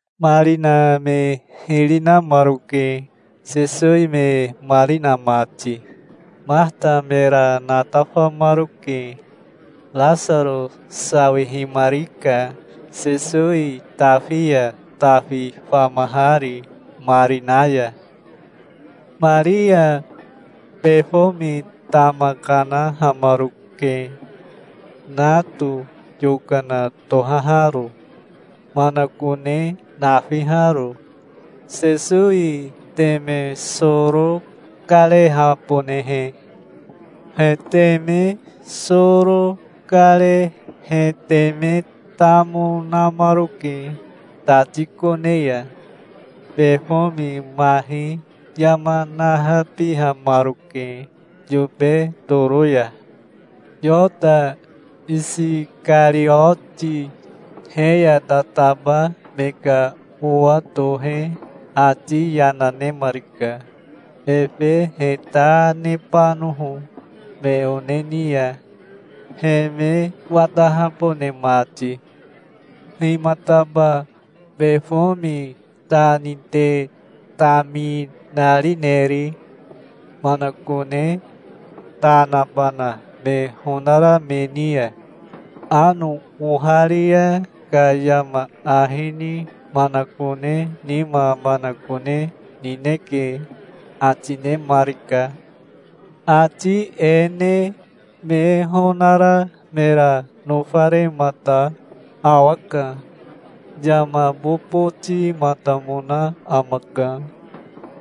Marina me hiri namaroke, Sesowi me mari na mati. Mahata mera natafamaroke. Rasaro sawihimarika Sesowi tafi ya tafi famahari marina ya. Maria befomi tama kanahamaroke, nato yokana tohaharo, manakone nafiharo, Sesowi teme soro karehabonehe. He teme soro kare he teme tamo namaroke tati kone ya. Befomi mahi yama nahabihamaroke yobe toro ya. Yota Isikarioti he ya tataba me ka owa tohe ati yana nemarika, efe he ta nebanoho me one ni ya, he me watahabone mati. "Himataba befomi ta ni te taminarineri, manakone ta nabana me honara me ni ya? Ano oharia ka yama ahi ni manakone nima manakone nineke", ati nemarika. Ati e ne me honara mera nofaremata awaka. Yama bobotimatamona amaka.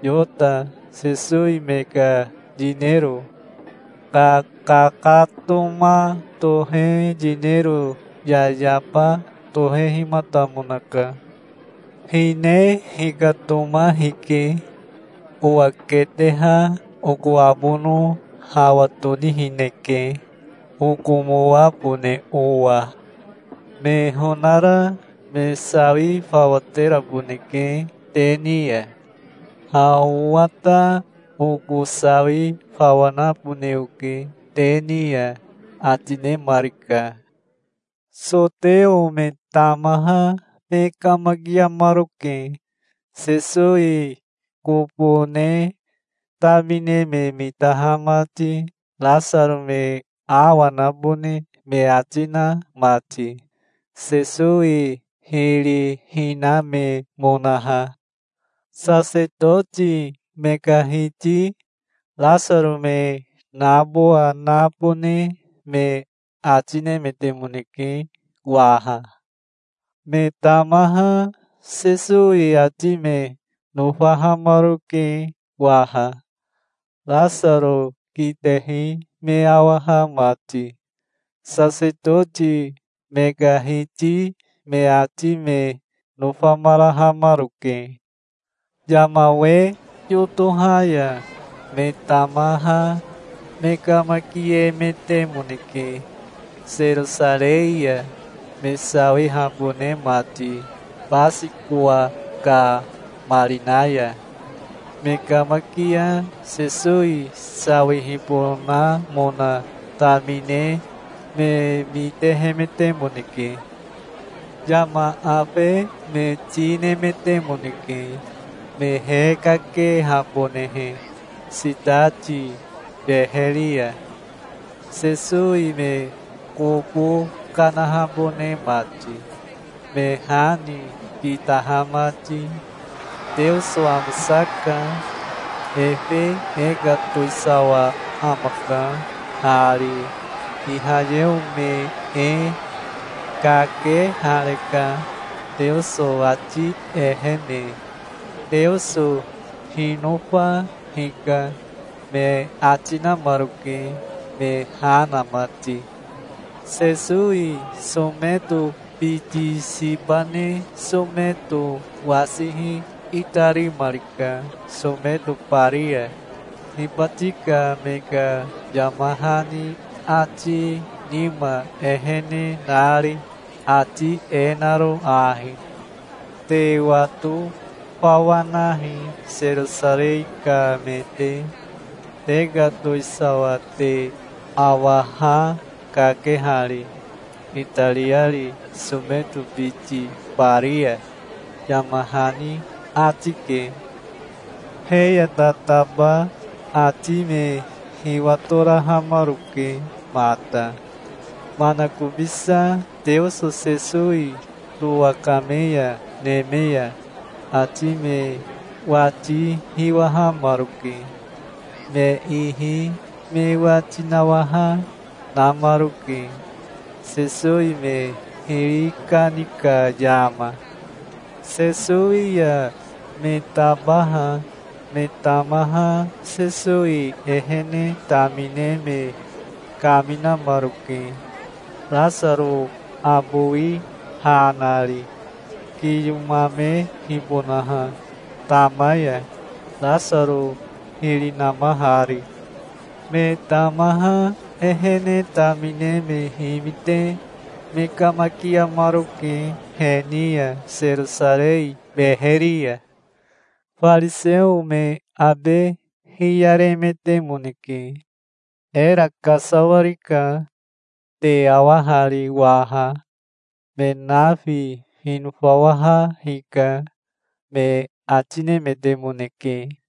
Yota Sesowi me ka yinero kakakatoma tohe yinero yayaba tohehimatamonaka. "Hine hikatoma hike. Owa keteha oko abono hawa tonihineke, okomoabone owa. Me honara me sawi fawa teraboneke te ni ya. Ha owa ta oko sawi fawa nabone oke te ni ya", ati nemarika. Soteo me tamaha me kamakiamaroke, Sesowi kobo ne tamine me mitaha mati, Rasaro me awa nabone me ati na mati, Sesowi hiri hinamemonaha. Sasetoti me ka hiti Rasaro me nabowa nabone me ati nemetemoneke waha. Me tamaha Sesowi ati me nofahamaroke waha, Rasaro kitehi me awaha mati. Sasetoti me ka hiti me ati me nofamarahamaroke. Yama we yotoha ya me tamaha me kamakiemetemoneke Serosarei ya, me sawihabone mati Basikowa ka marina ya. Me kamakia Sesowi sawihibonamona tamine me mitehemetemoneke. Yama afe me ti nemetemoneke, me hekakehabonehe sitati beheri ya, Sesowi me kobo kanahabone mati, me ha ni kitaha mati. "Teoso amosaka. Efe e ka towisawa amaka hari, Ihayeo me e. Kakehareka Teoso ati ehene. Teoso hinofa hika", me ati namaroke, me ha na mati. Sesowi someto biti siba ne someto wasihi itarimarika someto bari ya, hibati ka me ka yama hani ati nima ehene nari, ati e naro ahi: "Te wato fawa nahi Serosarei ka me te. Te ka towisawa te awa ha kakehari, itariari someto biti bari ya", yama hani ati ke. He ya tataba ati me hiwatorahamaroke mata. Manakobisa Teoso Sesowi towakame ya neme ya ati me wati hiwahamaroke. Me ihi me wati nawaha namaroke, Sesowi me hiri kani ka yama. Sesowi ya me tabaha me tamaha Sesowi ehene tamine me kaminamaroke, Rasaro abowi ha nari, kiyomamehibonaha tama ya, Rasaro hiri namahari. Me tamaha ehene tamine me himite me kamakiamaroke he ni ya Serosarei beheri ya. Fariseo me abe hiyaremetemoneke. "Era kasawarika. Te awa hari waha. Me nafi hinofawaha hika", me ati nemetemoneke.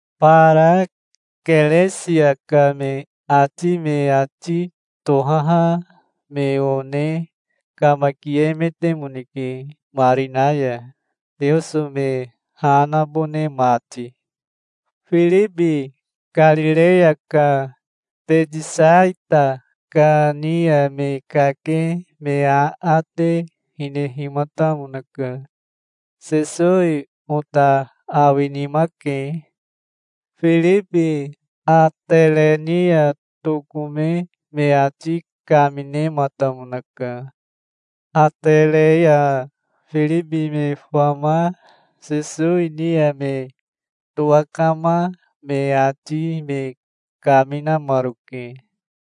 Bara Keresia ka me ati me ati tohaha me one kamakiemetemoneke marina ya, Teoso me ha nabone mati. Firibi Karireya ka Betisaita ka ni ya me kake me aate hinehimatamonaka. "Sesowi ota awinima ke". Firibi Atere ni ya tokome me ati kaminematamonaka. Atere ya Firibi me fama Sesowi ni ya me towakama me ati me kaminamaroke.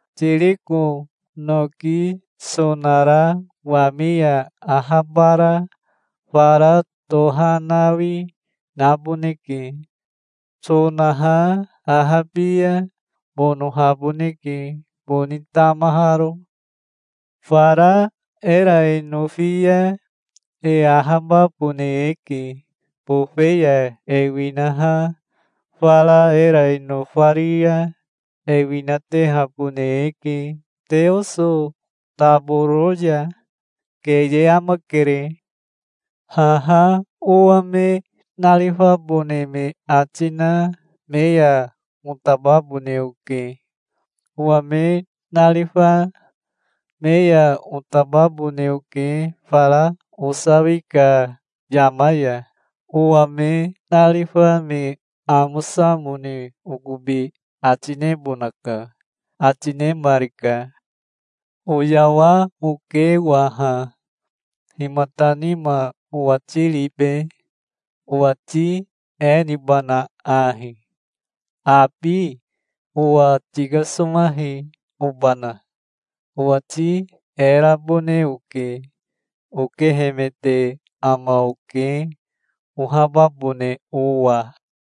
Tiriko noki sonara wami ya ahabara fara tohanawi naboneke. Sonaha ahabi ya bonohaboneke, boni tamaharo. Fara era e nofi ya e ahababone eke. Bofe ya e winaha fara era e nofari ya e winatehabone eke Teoso taboro ya. Keye amakere. Haha owa me narifabone me ati na me ya otababone oke. Owa me narifa me ya otababone oke fara osawi ka yama ya. Owa me narifa me amosamone okobi ati nebonaka", ati nemarika. "Oyawa oke waha. Himata nima owati ribe? Owati e nibana ahi? Abi owa tikasomahi, obana? Owati e rabone oke. Okehemete ama oke ohababone owa.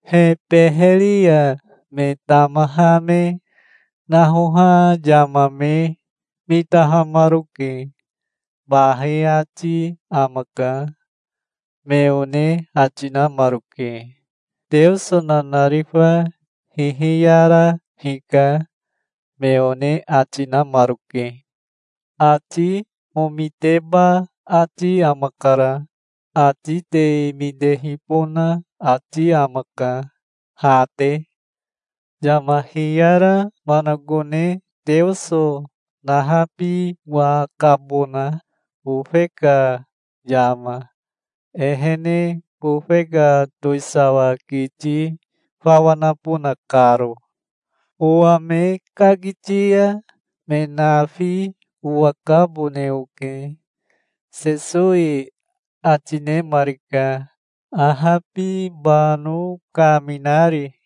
He beheri ya me tamaha me nahoha yama me mitahamaroke. "Bahi ati amaka", me one ati namaroke. "Teoso nanarifa hihiyara hika", me one ati, namaroke. "Ati omiteba ati amakara. Ati te mitehibona ati amaka, ha te. Yama hiyara manakone Teoso nahabiwakabona, bofe ka yama, ehene bofe ka towisawa kiti fawa nabona karo. Owa me kakiti ya me nafi owakabone oke", Sesowi ati nemarika, ahabibano kaminari.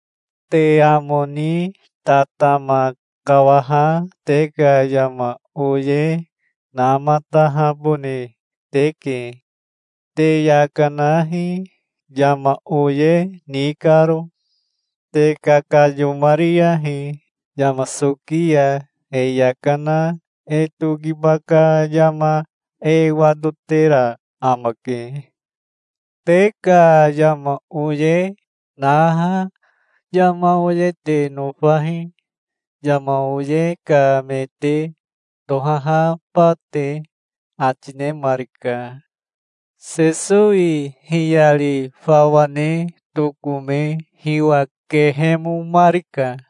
"Te amo ni tatama kawaha te ka yama oye namatahabone teke. Te yaka nahi, yama oye ni karo. Te kakayomariyahi. Yama soki ya e yaka na e tokiba ka yama e watotera amake. Te ka yama oye naha yama oye te nofahi, yama oye ka me te tohahaba te", ati nemarika. Sesowi hiyari fawa ne tokome hiwa kehemomarika.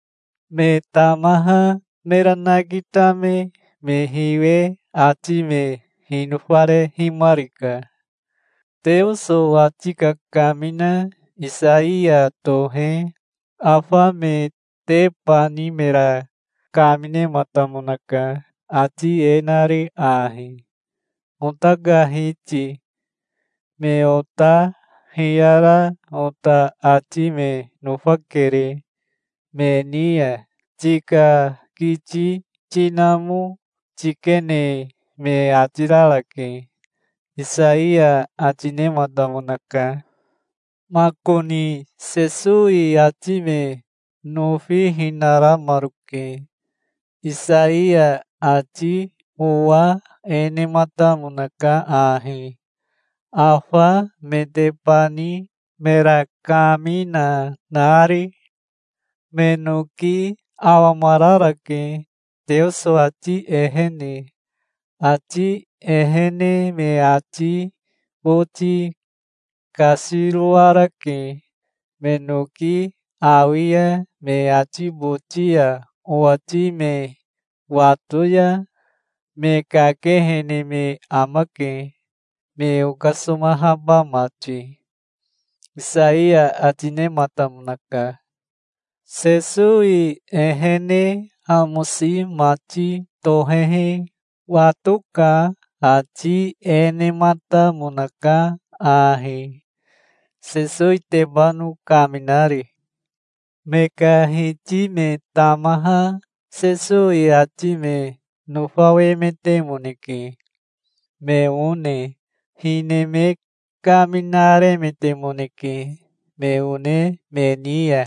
Me tamaha mera nakitame me hiwe ati me hinofarehimarika. Teoso ati kakamina Isaiya tohe afa metebani mera kaminematamonaka, ati e nari ahi: "Ota ka Hiti, me ota hiyara ota ati me nofakere. Me ni ya tika kiti tinamo tikene me ati rarake", Isaiya ati nematamonaka. Makoni Sesowi ati me nofihinaramaroke. Isaiya ati owa e nematamonaka ahi, afa metebani mera kamina nari: "Me noki awamararake, Teoso ati ehene. Ati ehene me ati boti kasiroarake. Me noki awi ya, me ati boti ya owati me wato ya, me kakehene me amake, me okasomahaba mati", Isaiya ati nematamonaka. Sesowi ehene amosi mati tohehi wato ka ati e nematamonaka ahi, Sesowitebano kaminari. Me ka hiti me tamaha Sesowi ati me nofawemetemoneke, me one. Hine me kaminaremetemoneke me one me ni ya,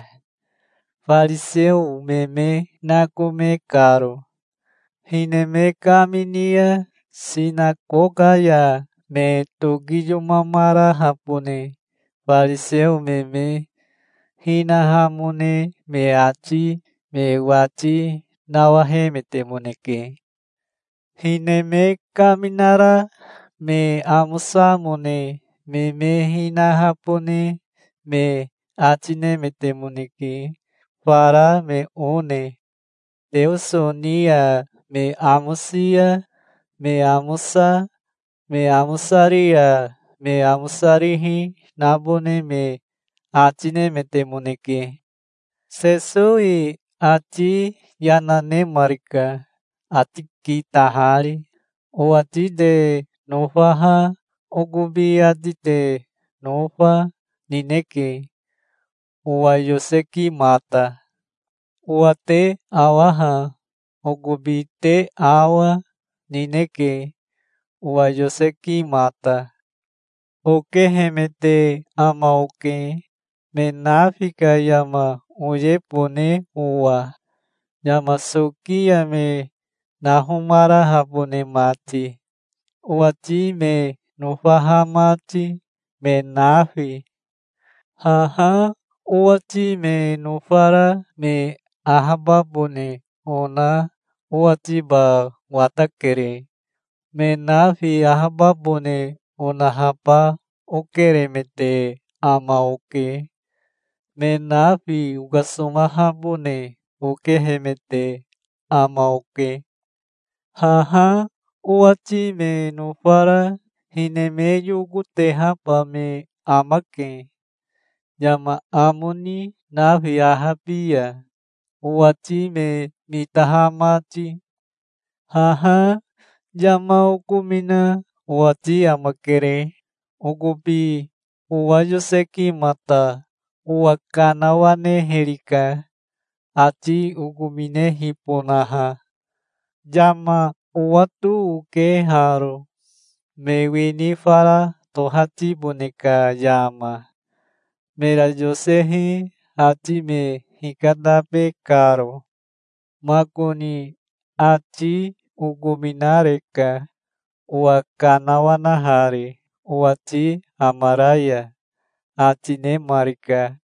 fariseo me me nakome karo. Hine me kamini ya sinakoka ya me tokiyomamarahabone fariseo me me hinahamone me ati me wati nawahemetemoneke. Hine me kaminara me amosamone me me hinahabone me ati nemetemoneke fara me one. Teoso ni ya me amosi ya me amosa, me amosari ya me amosarihi nabone me ati nemetemoneke. Sesowi ati yana nemarika ati kitahari. "Owati te nofaha okobi ati te nofa, nineke, owa yosekimata. Owa te awaha okobi te awa, nineke, owa yosekimata. Okehemete ama oke, me nafi ka yama oyebone owa, yama soki ya me nahomarahabone mati, owati me nofaha mati, me nafi. Haha owati me nofara me ahababone ona owatiba watakere. Me nafi ahababone onahaba okeremete ama oke. Me nafi okasomahabone okehemete ama oke. Haha owati me nofara hine me yokotehaba me amake yama amo ni nafi ahabi ya, owati me mitaha mati. Haha yama okomina owati amakere. Okobi owa yosekimata owa kanawanehirika, ati okominehibonaha. Yama owato oke haro, me wini fara tohatibone ka yama, mera yosehi ati me hikatabe karo. Makoni ati okominareka, owa kanawanahari owati amara ya", ati nemarika.